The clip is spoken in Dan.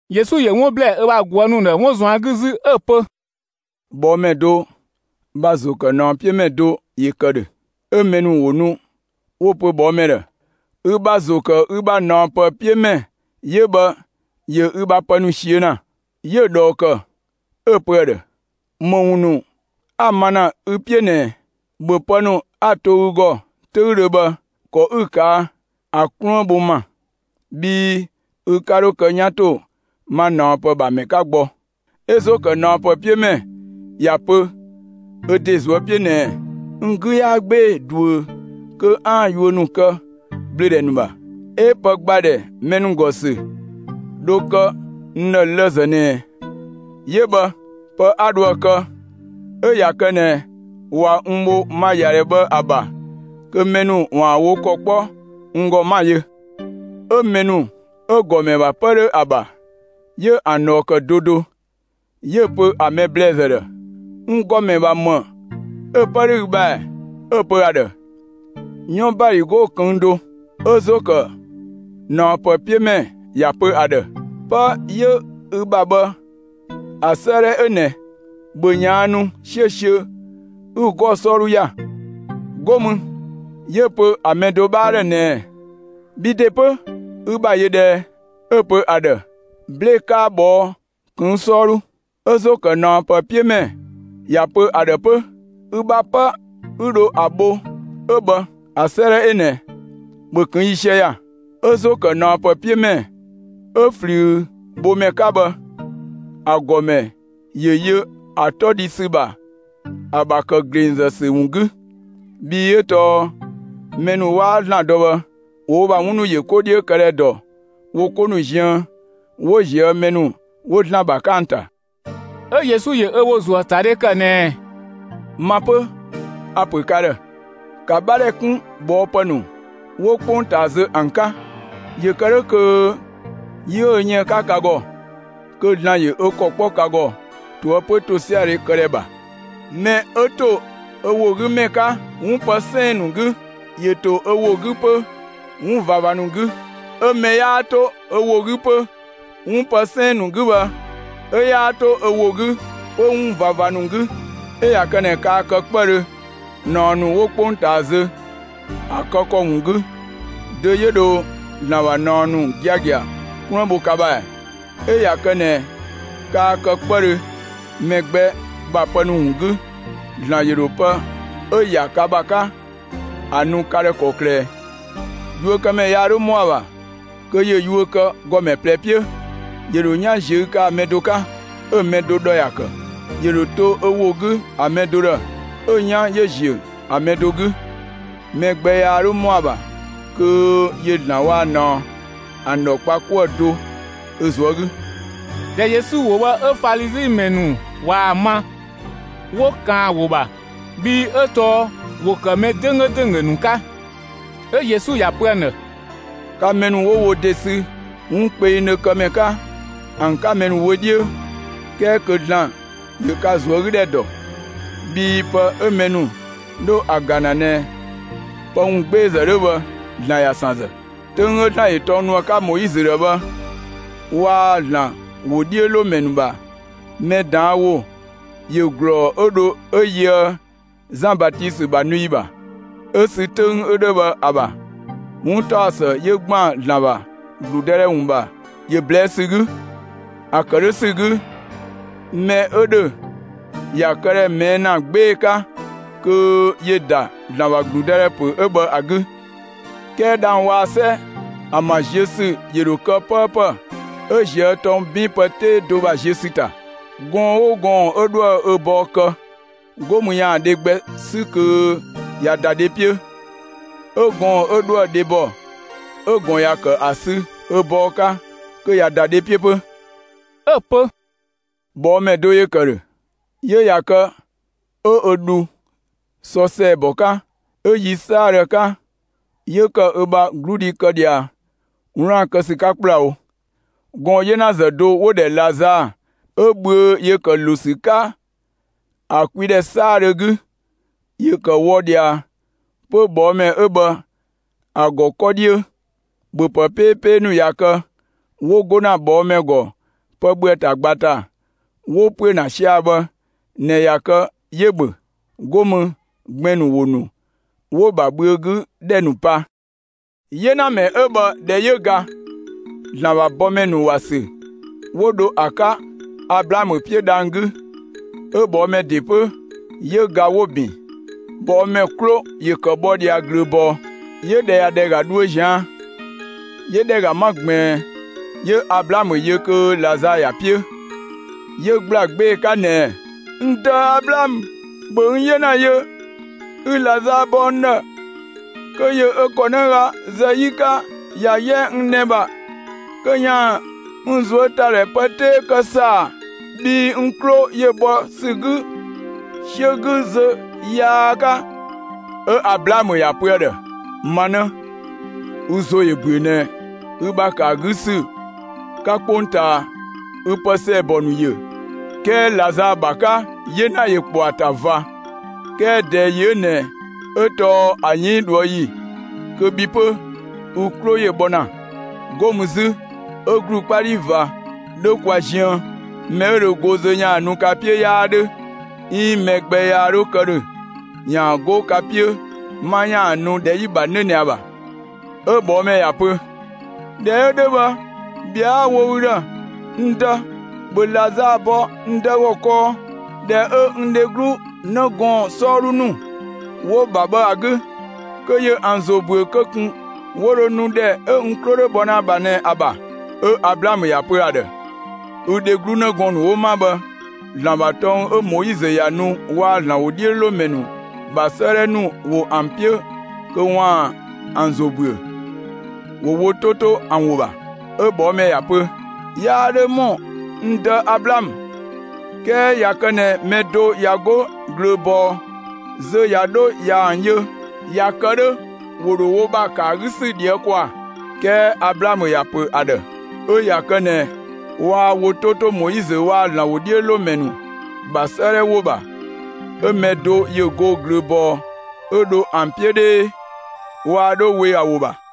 Yesu ‑yö 'wun ‑blɛɛ 'ö ‑bha ꞊guë' ‑nu ‑dhë 'wun ꞊zuan' 'gü 'zü 'ö‑ pö: «꞊Bhɔɔmɛ do ‑bha ‑zo ‑kë ꞊naɔpë 'piö ‑mɛ do ‑yö ‑kë ‑dhö. 'Ö mɛ ‑nu ‑wo nu 'wo‑ ‑pö ꞊bhɔɔmɛ ‑dhë: ‹Ü ‑bha ‑zo ‑kë ü ‑bha ꞊naɔpë 'piö ‑mɛ 'yö bhë ‑yö ü ‑bha pë ‑nu ꞊siö' ‑na.› 'Yö‑ ꞊dhɔɔ ‑kë 'ö‑ pö ‑a ‑dhë: ‹‑Më ‑wun ‑nu 'a‑ ma ‑na ü 'piö ꞊nɛɛ ꞊ɛ? ‑Bhö pë ‑nu 'a‑ to ü ‑gɔ 'töüdhö bhë ‑kɔ 'ü‑ ‑kë ‑a 'ka ‑a 'kluën bho n ‑ma, bhii ü 'ka 'dho kë 'yan ‑to ma ꞊naɔpë ‑bha ‑mɛ 'ka gbɔ.› 'Ö ‑zo ‑kë ꞊naɔpë 'piö ‑mɛ ‑ya pö ö ‑de ꞊zuö' 'piö ꞊nɛɛ: ‹N 'gü 'yaa 'gbee‑ ꞊duö kö 'aan‑ yuö ‑nu kë ꞊bhlöödhɛ ‑nu ‑bha, 'ö pë ‑gba ‑dhɛ mɛ ‑nu ‑gɔ ‑sü dho kë n ‑dhë lëzë ꞊nɛɛ. 'Yö bhë! Pë 'a dho ‑a kë 'ö ꞊ya kë ꞊nɛ ꞊wa n bho ma ‑yadhɛ bhë ‑a ‑bha kö mɛ ‑nu ‑waan wo ‑kɔ 'kpɔ n ‑gɔ 'ma‑ yö!› 'Ö mɛ ‑nu 'ö‑ ‑gɔmɛ ‑bha 'pë 'dho ‑a ‑bha, 'yö ‑an ꞊dhɔɔ ‑kë do do; 'yö‑ pö ‑a mɛ ‑blɛɛzë ‑dhë: ‹N ‑gɔmɛ ‑bha ‑më 'ö 'pë 'dho ü ‑bha ‑ɛ?› 'Ö‑ pö ‑a ‑dhë: ‹'Yɔn ꞊baligo ꞊këng' do.› 'Ö ‑zo ‑kë ꞊naɔpë 'piö ‑mɛ ‑ya pö ‑a ‑dhë: ‹'Pë 'yö ü ‑bha bhë ‑a 'sëëdhɛ 'ö ꞊nɛ, ‑bhö ꞊yaannu 'siösiö 'ü 'gɔɔ‑ 'sɔɔdhu ‑ya!› 'Go mü 'yö‑ pö ‑a mɛ do 'bhaa ‑dhë ꞊nɛɛ: ‹Bhi ‑de 'pö, ü ‑bha ‑yö ꞊dhë ꞊ɛ?› 'Ö‑ pö ‑a ‑dhë: ‹'Blee‑ 'kaa ꞊bhɔɔ' ꞊këng' 'sɔɔdhu.› 'Ö ‑zo ‑kë ꞊naɔpë 'piö ‑mɛ ‑ya pö ‑a ‑dhë 'pö: ‹Ü bha 'pë 'ü dho ‑a bho 'ö bhë ‑a 'sëëdhɛ 'ö ꞊nɛ, ‑bhö ꞊këng' ‑yiisië ‑ya!› 'Ö ‑zo ‑kë ꞊naɔpë 'piö ‑mɛ 'ö ꞊flüübhömɛ 'ka bhë, ‑a ‑gɔmɛ ‑yö yö ‑a 'tɔ dhi ‑sü ‑bha ‑a ‑bha ‑kë ‑glengzë ‑sü ‑wun 'gü, bhii 'ö tɔɔ mɛ ‑nu 'waa ‑Zlan dɔ bhë, ‑wo wo ‑bha 'wun ‑nu ‑yö 'ko 'dhiö këdhɛ ‑dɔ wo 'ko ‑nu ziën 'wo ꞊zië' mɛ ‑nu 'wo ‑Zlan ‑bha 'ka ‑an ‑ta.» 'Ö Yesu ‑yö ö ‑wo ‑zuö ‑a ‑ta dhe ‑kë ꞊nɛɛ: «Ma 'pö, a‑ ‑pö ka ‑dhë: ‑Ka 'bhadhɛ 'kun ꞊bhɔɔpë ‑nu 'wo 'kpongtaa zö ‑an 'ka, ‑yö ‑kë 'dhö kö yi 'ö dho yën ‑a 'ka ka ‑gɔ, kö ‑Zlan ‑yö ö ‑kɔ 'kpɔ ka ‑gɔ ꞊toëpö ‑tosiadhe këdhɛ ‑bha. Mɛ 'ö ‑to ö ‑wo 'gü ‑mɛ 'ka 'wun pë 'sɛɛn‑ ‑nu 'gü, ‑yö ‑to ö ‑wo 'gü 'pö 'wun ꞊vava ‑nu 'gü; 'ö mɛ 'yaa 'to ö ‑wo 'gü 'pö 'wun pë 'sɛɛn‑ ‑nu 'gü bhë, 'ö 'yaa 'to ö ‑wo 'gü 'pö 'wun ꞊vava ‑nu 'gü. 'Ö ꞊ya kë ꞊nɛ kaa kë 'kpëdhö ꞊naɔ ‑nu 'wo 'kpongtaa zö ‑a kë ‑kɔ ‑wun 'gü, dö 'yö dho ‑Zlan ‑bha ꞊naɔ ‑nu giagia 'kluën bho ka ‑bha ‑ɛ? 'Ö ꞊ya kë ꞊nɛ kaa kë 'kpëdhö mɛ gbɛ ‑bha pë ‑nu ‑wun 'gü, ‑Zlan ‑yö ‑dho pë 'ö‑ ‑ya ka ‑bha 'ka ‑a nu ka ‑dhë ‑kɔklë ꞊ɛ? Yuökëmɛ yaa 'dho ‑mɔ ‑a ‑bha kö ‑yö yuö kë ‑gɔmɛ ꞊plɛ 'piö; ‑yö ‑dho 'yan ꞊ziö' kë ‑a mɛ do 'ka, 'ö‑ mɛ do ‑dhɔ ‑ya ‑kë; ‑yö ‑dho to ö ‑wo 'gü mɛ do ‑dhë, 'ö‑ 'yan ‑yö ‑ziö ‑a mɛ do 'gü. Mɛ gbɛ yaa 'dho ‑mɔ ‑a ‑bha kö ‑yö ‑Zlan waa‑ ꞊naɔ ‑an ‑dhɔ kpa 'kuë‑ do ö ꞊zuö' 'gü.» ꞊Dhɛ Yesu ‑wo bhë 'ö Falizi ‑mɛ ‑nu ꞊waa‑ ma, 'wo ꞊kaan ‑a ‑wo ‑bha, bhii 'ö tɔɔ ‑wo ‑kë mɛ 'dönggö ‑dönggö ‑nu 'ka. 'Ö Yesu ‑ya pö ‑an ‑dhë: «Ka mɛ ‑nu 'wo wo ‑de sü 'wun kpengdhö kë ‑mɛ 'ka ‑an 'ka mɛ ‑nu wö 'dhiö, 'kɛɛ kö ‑Zlan ‑yö ka ꞊zuögüdhɛ ‑dɔ; bhii pë 'ö mɛ ‑nu 'dho ‑a ‑ga ‑na ꞊nɛ pë ‑wun 'gbeezë 'dhö bhë, ‑Zlan ‑ya ‑san ‑zë. 'Töng 'ö ‑Zlan ‑yö tɔng nu ‑a 'ka Moizö ‑dhë bhë waa‑ ‑Zlan ‑wodhiölomɛ ‑nu ‑bha mɛ ꞊daan' ‑wo ‑yö ‑glɔɔ 'ö dho 'ö yöë Zan Batisö ‑bha nu ‑yi ‑bha. 'Ö sü 'töng 'ö 'dhö bhë ‑a ‑bha, 'wuntaɔsë 'yö ‑gban ‑Zlan ‑bha ‑gludëdhɛ ‑wun ‑bha ‑yö ꞊blɛɛ' ‑sü 'gü; ‑a kë 'dhö ‑sü 'gü, mɛ 'ö ‑dhö ‑ya këdhɛ ꞊mɛɛ' ‑na 'gbee‑ 'ka kö ‑yö ‑da ‑Zlan ‑bha ‑gludëdhɛ ‑pö 'ö bhë ‑a 'gü. 'Kɛɛ dhang‑ waa‑ 'sɛ ‑an ‑bha ziö ‑sü ‑yö ‑dho kë 'pëëpë 'ö ꞊zië' tɔng 'bin pë 'tee do ‑bha ziö ‑sü ‑ta. Gɔɔn‑ 'oo gɔɔn‑ 'ö 'dhoë‑ ö bɔɔ kë, 'go mü ‑yaan dhe gbɛ 'sü kö ꞊ya ‑da dhe 'piö; 'ö gɔɔn‑ 'ö 'dhoë‑ dhebɔ 'ö‑ ꞊gɔn ‑ya ‑kë ‑a sü ö bɔɔ 'ka kö ꞊ya ‑da dhe 'piö 'pö.» 'Ö‑ pö: «꞊Bhɔɔmɛ do ‑yö ‑kë ‑dhö, 'yö ꞊ya kë 'ö ö dhu sɔ ‑sɛɛbɔ 'ka. 'Ö yi 'saadhö ‑a 'ka, 'yö ‑kë ö bha 'gludhi kë ꞊dhia 'wlaan‑ kë ‑sü 'ka ‑kplawo. Gɔɔn‑ 'yenazë do 'wo‑ ‑dhɛ Lazaa 'ö bhüö ‑yö ‑kë ‑lo ‑sü 'ka ‑a kwi ‑dhɛ 'saadhö 'gü, ‑yö ‑kë wɔ ꞊dhia 'pö ꞊bhɔɔmɛ 'ö bhë ‑a ‑gɔ 'kɔ 'dhiö. ‑Bhöpë 'peepee ‑nu ꞊ya kë 'wo 'go ‑na ꞊bhɔɔmɛ ‑gɔ pë ‑bhö ‑a ‑ta ꞊gba ‑ta, 'wo ‑püö ‑na sia‑ bhë ꞊nɛ ꞊ya kë 'yö‑ ‑bhö. 'Go mü gbɛn‑ ‑nu ‑wo ‑nu 'wo‑ ‑bha bhüögüdhɛ ‑nu pa. 'Yenamɛ 'ö bhë ꞊dhɛ 'yö ga, ‑Zlan ‑bha bɔmɛ ‑nu ‑wa sü 'wo dho ‑a 'ka Ablaamö 'piö dhang‑ 'gü. 'Ö ꞊bhɔɔmɛ ‑de 'pö, 'yö ga 'wo‑ ‑bin. ꞊Bhɔɔmɛ 'klo ‑yö ‑kë bhɔ ꞊dhia ꞊glööbɔɔ, 'yö ‑dhɛ ꞊ya ‑ga dhuö ꞊zian', 'yö ‑dhɛ ‑ga 'ma ꞊gbiin, 'yö Ablaamö yö kö Lazaa ‑ya 'piö. 'Yö ‑gbla 'gbee‑ 'ka ꞊nɛɛ: ‹N dë Ablaamö, ‑bhö n 'yena yö, 'ü Lazaa bɔ n ‑dhë kö ‑yö ö ‑kɔnëga zë 'yi 'ka ‑ya 'yɛ n nɛ‑ ‑bha kö ‑yaan n ꞊zuötadhɛ pë 'tee kë ‑saa, bhii n 'klo ‑yö bhɔ ‑sü 'gü 'siö 'gü zö yaa 'ka.› 'Ö Ablaamö ‑ya ‑pö ‑a ‑dhë: ‹Ma 'në, ü ‑zo ‑yö ‑büö ꞊nɛ ü ‑bha ‑kë ‑a 'gü ‑sü 'ka 'kpongtaa, ü pë ‑sɛɛbɔ ‑nu ‑yö, 'kɛɛ Lazaa ‑bha 'ka 'yena ‑yö ‑kpɔ ‑a ‑ta ꞊va; 'kɛɛ ꞊dɛɛ ‑yi 'ö ꞊nɛ 'ö tɔɔ ‑a 'yënng ꞊dhuë' ‑yi kö bhi 'pö, ü 'klo ‑yö bhɔ ‑na. 'Go mü 'zü, 'ö ‑glu 'kpa 'dhi ꞊va 'dho kwa ziën; mɛ 'ö dho go zö ‑yaan nu ka 'piö 'yaa 'dhö, 'iin mɛ gbɛ yaa 'dho kë ‑dhö ‑yaan 'go ka 'piö 'ma ‑yaan nu ‑dhɛ 'yi‑ ‑bha 'nö ꞊nɛ ‑a ‑bha.› 'Ö ꞊bhɔɔmɛ ‑ya pö: ‹꞊Dhɛ 'ö 'dhö bhë, ꞊bhɛa'‑ 'a‑ wo ü ‑dhë, n dë, ‑bhö Lazaa bɔ n dë ‑gɔ kɔɔ ‑dhɛ 'ö n dheglu 'në gɔɔn‑ 'sɔɔdhu ‑nu 'wo‑ ‑bha bhë ‑a 'gü, kö ‑yö ‑an ‑zo ‑büö kö ꞊kun 'wo dho nu ‑dhɛ 'ö n 'klo 'dho bhɔ ‑na ‑a ‑bha ꞊nɛ ‑a ‑bha.› 'Ö Ablaamö ‑ya pö ‑a ‑dhë: ‹Ü dheglu 'në gɔɔn‑ ‑nu 'wo 'ma bhë, ‑Zlan ‑bha tɔng 'ö Moizö ‑ya nu waa‑ ‑Zlan ‑wodhiölomɛ ‑nu ‑bha 'sëëdhɛ ‑nu ‑wo ‑an 'piö kö ‑waan ‑an ‑zo ‑büö; ‑wo wo 'to 'to ‑an ‑wo ‑bha!› 'Ö ꞊bhɔɔmɛ ‑ya pö: ‹Yaa 'dho ‑mɔ, n dë Ablaamö, 'kɛɛ ꞊ya kë ꞊nɛ mɛ do ꞊ya 'go ꞊glööbɔɔ zö ꞊ya 'dho ꞊ya ‑an yö, ꞊ya kë 'dhö ‑wo ‑dho wo ‑bha ‑kë ‑a 'gü ‑sü ꞊dhië' ‑kwaa.› 'Kɛɛ Ablaamö ‑ya ‑pö ‑a ‑dhë: ‹'Ö ꞊ya kë ꞊nɛ waa wo 'to 'to Moizö waa‑ ‑Zlan ‑wodhiölomɛ ‑nu ‑bha 'sëëdhɛ ‑wo ‑bha, 'ö mɛ do ‑yö go ꞊glööbɔɔ 'ö dho ‑an 'piö 'dhee, waa 'dho we ‑a ‑wo ‑bha.›»